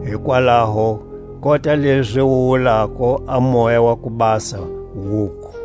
Hikwalaho, kota lezi wu wulako a Moya wa ku Basa, wuku: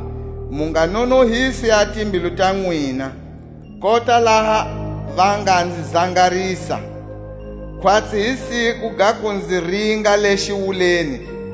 Mu nga nonohisi a timbilu ta nwina kota laha va nga nzi zangarisa, Khwatsi hi siku ga ku nzi ringa le xiwuleni,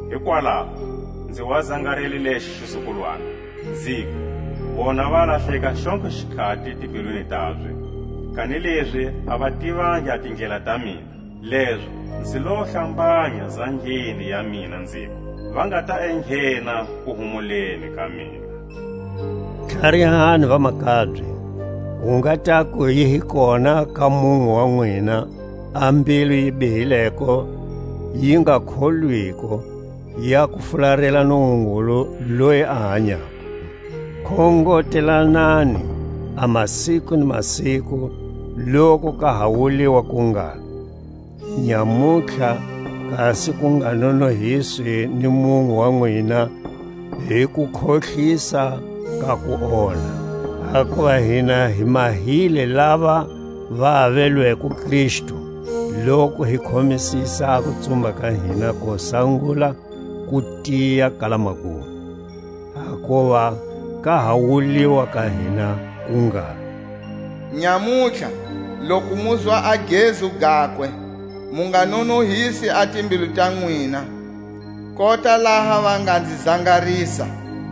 Hikwalaho nzi wa zangarele lexo xizukulwana, Nziku: Vona va lahleka xontlhe xikhati timbilwini tabye. Kanilezi a va tivangi a tindlela ta mina. Lezo nzi lo hlambanya zangeni ya mina, nziku: Va nga ta enghena kuhumuleni ka mina. Tlharihani vamakabye, ku nga taku yi hi kona ka munwe wa nwina a mbilu yi bihileko yi nga kholwiko, ya ku fularela Nungungulu loyi a hanyako. Khongotelanani a masiku ni masiku, loku ka ha wuliwa ku ngalo: Nyamutlha; kasi ku nga nonohiswi ni munwe wa nwina hi kukhohlisa ka kuonha. Hakuva hina hi mahile lava va avelweko Kristu, loku hi khomisisa a kutsumba ka hina ko sangula ku tiya kala magumo, Hakuva ka ha wuliwa ka hina ku ngalo: Nyamutlha loku muzwa a gezu gakwe, Mu nga nonohisi a timbilu ta nwina kota laha va nga nzi zangarisa.